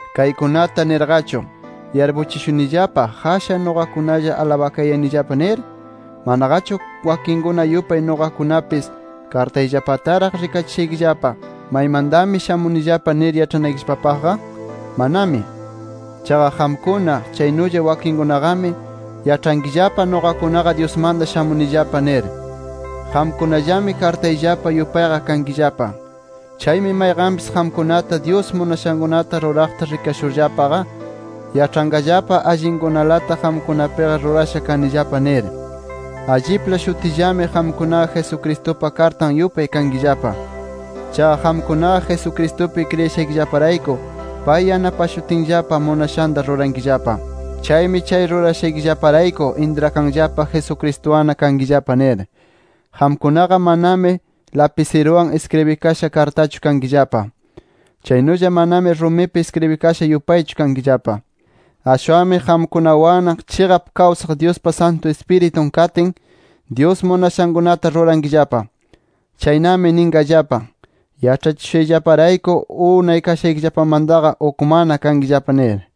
Kaykunata nirqachu, ¿yarpuchishunillapa, qashan nuqakunalla alabakayanillapa nir? ¿Manaqachu wakinkuna yupay nuqakunapis kartayllapataraq rikachishaykillapa, maymantami shamunillapa nir yaĉhanaykillapapaqqa? ¡Manami! Chaqa qamkuna, chaynulla wakinkunaqami yaĉhankillapa nuqakunaqa, Dyusmanta shamunillapa nir. Qamkunallami kartayllapa yupayqa kankillapa. Chaymi mayqanpis qamkunata, Dyus munashankunata ruraqta rikashurllapaqa, yaĉhanqallapa allinkunalata qamkunapiqa rurasha kanillapa nir. Allipla shutillami qamkunaqa Jesucristupa kartan yupay kankillapa. Chaqa qamkunaqa Jesucristupi kriyishaykillaparayku pay yanapashutinllapa munashanta rurankillapa. Chaymi chay rurashaykillaparayku intrakanllapa Jesucristuwanna kankillapa nir. Qamkunaqa manami lapisiruwan iskribikasha kartachu kankillapa. Chaynulla manami rumipi iskribikasha yupaychu kankillapa. Ashwanmi, qamkunawanna chiqap kawsaq Dyuspa Santu Ispiritun katin, Dyus munashankunata rurankillapa. Chaynami ninqallapa, yaĉhachishushayllaparayku unay kashaykillapamantaqa ukmanna kankillapa nir.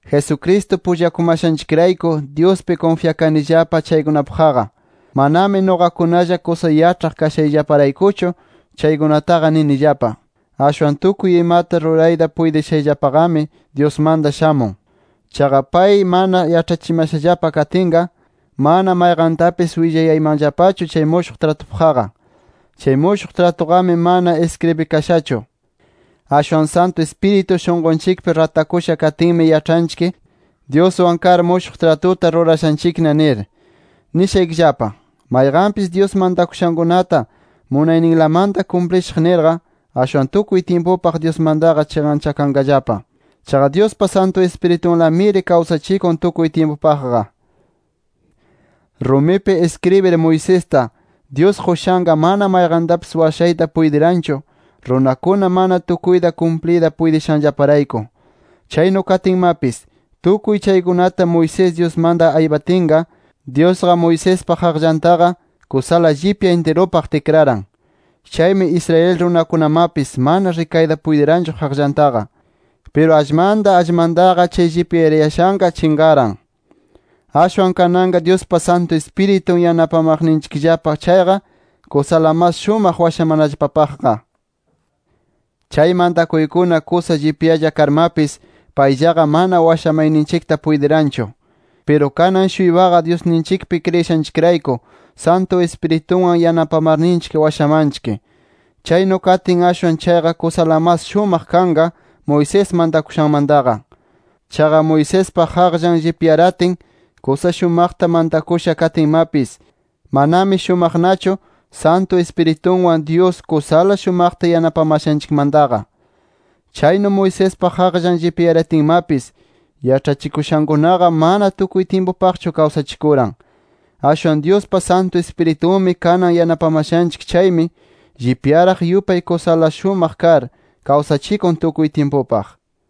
Jesucristo pullakumashanchikrayku, Dyuspi kunfyakanillapa chaykunapaqqa. Manami nuqakunalla kusa yaĉhaq kashayllaparaykuchu chaykunataqa ninillapa. Ashwan tukuy imata rurayta puytishayllapaqami, Dyusmanta shamun. Chaqa pay mana yaĉhachimashallapa katinqa, mana mayqantapis willayaymanllapachu chay mushuq tratupaqqa. Chay mushuq tratuqami mana iskribikashachu. Ashwan Santu Ispiritu shunqunchikpi ratakusha katinmi yaĉhanchik, Dyuswan kar mushuq tratuta rurashanchikna nir. Nishaykillapa: Mayqanpis Dyus mantakushankunata munayninlamanta kumplishaq nirqa, ashwan tukuy tyimpupaq Dyusmantaqa chiqanchakanqallapa. Chaqa Dyuspa Santu Ispiritunlamiri kawsachikun tukuy tyimpupaqqa. Rumipi iskribir Moisesta, Dyus qushanqa, mana mayqantapis washayta puytiranchu, runakuna mana tukuyta kumpliyta puytishanllaparayku. Chaynu katinmapis, tukuy chaykunata Moisés Dyusmanta aypatinqa, Dyusqa Moisespa qaqllantaqa kusala llipya intirupaq tikraran. Chaymi Israel runakunamapis mana rikayta puytiranchu qaqllantaqa. Piru allmanta allmantaqa, chay llipyarayashanqa chinqaran. ¡Ashwan kananqa Dyuspa Santu Ispiritun yanapamaqninchikllapa chayqa, kusala mas shumaq washamanallapapaqqa! Chay mantakuykuna kusa llipyalla karmapis payllaqa mana washamayninchikta puytiranchu. Piru kanan-shuypaqa Dyusninchikpi kriyishanchikrayku Santu Ispiritunwan yanapamarninchik washamanchik. Chaynu katin ashwan chayqa kusala mas shumaq kanqa Moisés mantakushanmantaqa. Chaqa Moisespa qaqllan llipyaratin kusa shumaqta mantakusha katinmapis, manami shumaqnachu, Santu Ispiritunwan Dyus kusala shumaqta yanapamashanchikmantaqa. Chaynu Moisespa qaqllan llipyaratinmapis, yaĉhachikushankunaqa mana tukuy tyimpupaqchu kawsachikuran. Ashwan Dyuspa Santu Ispiritunmi kanan yanapamashanchik chaymi, llipyaraq yupay kusala mas shumaq kar, kawsachikun tukuy tyimpupaq.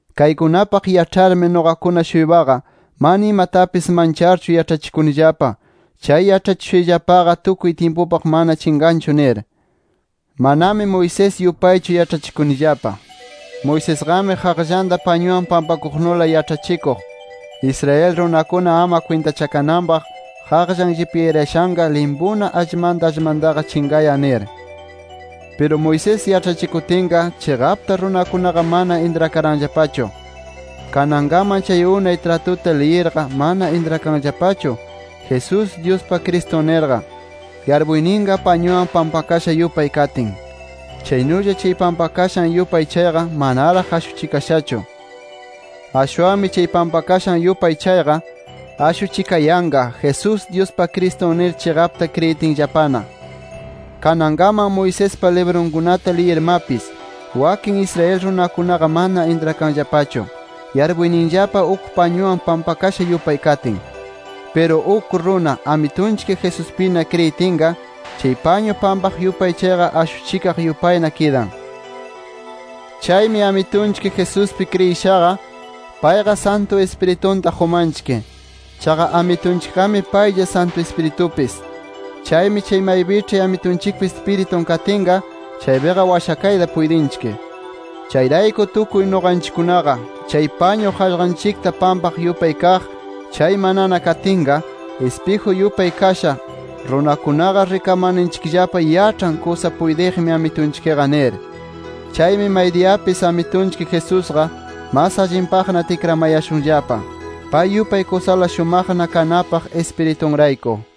Kaykunapaq yaĉharmi nuqakuna-shuypaqa, mana imatapis mancharchu yaĉhachikunillapa, chay yaĉhachikushayllapaqa tukuy tyimpupaq mana chinqanchu nir. Manami Moisés yupaychu yaĉhachikunillapa. Moisesqami qaqllanta pañuwan pampaqnula yaĉhachikuq, Israel runakuna ama kwintachakananpaq qaqllan llipyarayashanqa limpuna allmanta allmantaqa chinqayan nir. Piru Moisés yaĉhachikutinqa chiqapta runakunaqa mana intrakaranllapachu. Kanankaman chay unay tratuta liyirqa, mana intrakanllapachu Jesús, Dyuspa Cristun nirqa, yarpuyninqa pañuwan pampakasha yupay katin. Chaynulla chay pampakashan yupay chayqa manaraq ashuchikashachu. Ashwanmi chay pampakashan yupay chayqa, ashuchikayanqa Jesús, Dyuspa Cristun nir chiqapta kriyitinllapana. Kanankaman Moisespa librunkunata liyirmapis, wakin Israel runakunaqa mana intrakanllapachu, yarpuyninllapa uk pañuwan pampakasha yupay katin. Piru uk runa, Amitunchik Jesuspina kriyitinqa, chay pañu pampaq yupay chayqa ashuchikaq yupayna kidan. Chaymi Amitunchik Jesuspi kriyishaqa, payqa Santu Ispiritunta qumanchik. Chaqa Amitunchikqami paylla Santu Ispiritupis. Chaymi chay maypiĉhi Amitunchikpa Ispiritun katinqa, chaypiqa washakayta puytinchik. Chayrayku tukuy nuqanchikkunaqa, chay pañu qaqllanchikta pampaq yupay kaq chay manana katinqa, ispiju yupay kasha, runakunaqa rikamarninchikllapa yaĉhan kusa puytiqmi Amitunchikqa nir. Chaymi maydiyapis Amitunchik Jesusqa mas allinpaqna tikramayashunllapa, pay yupay kusala shumaqna kanapaq Ispiritunrayku.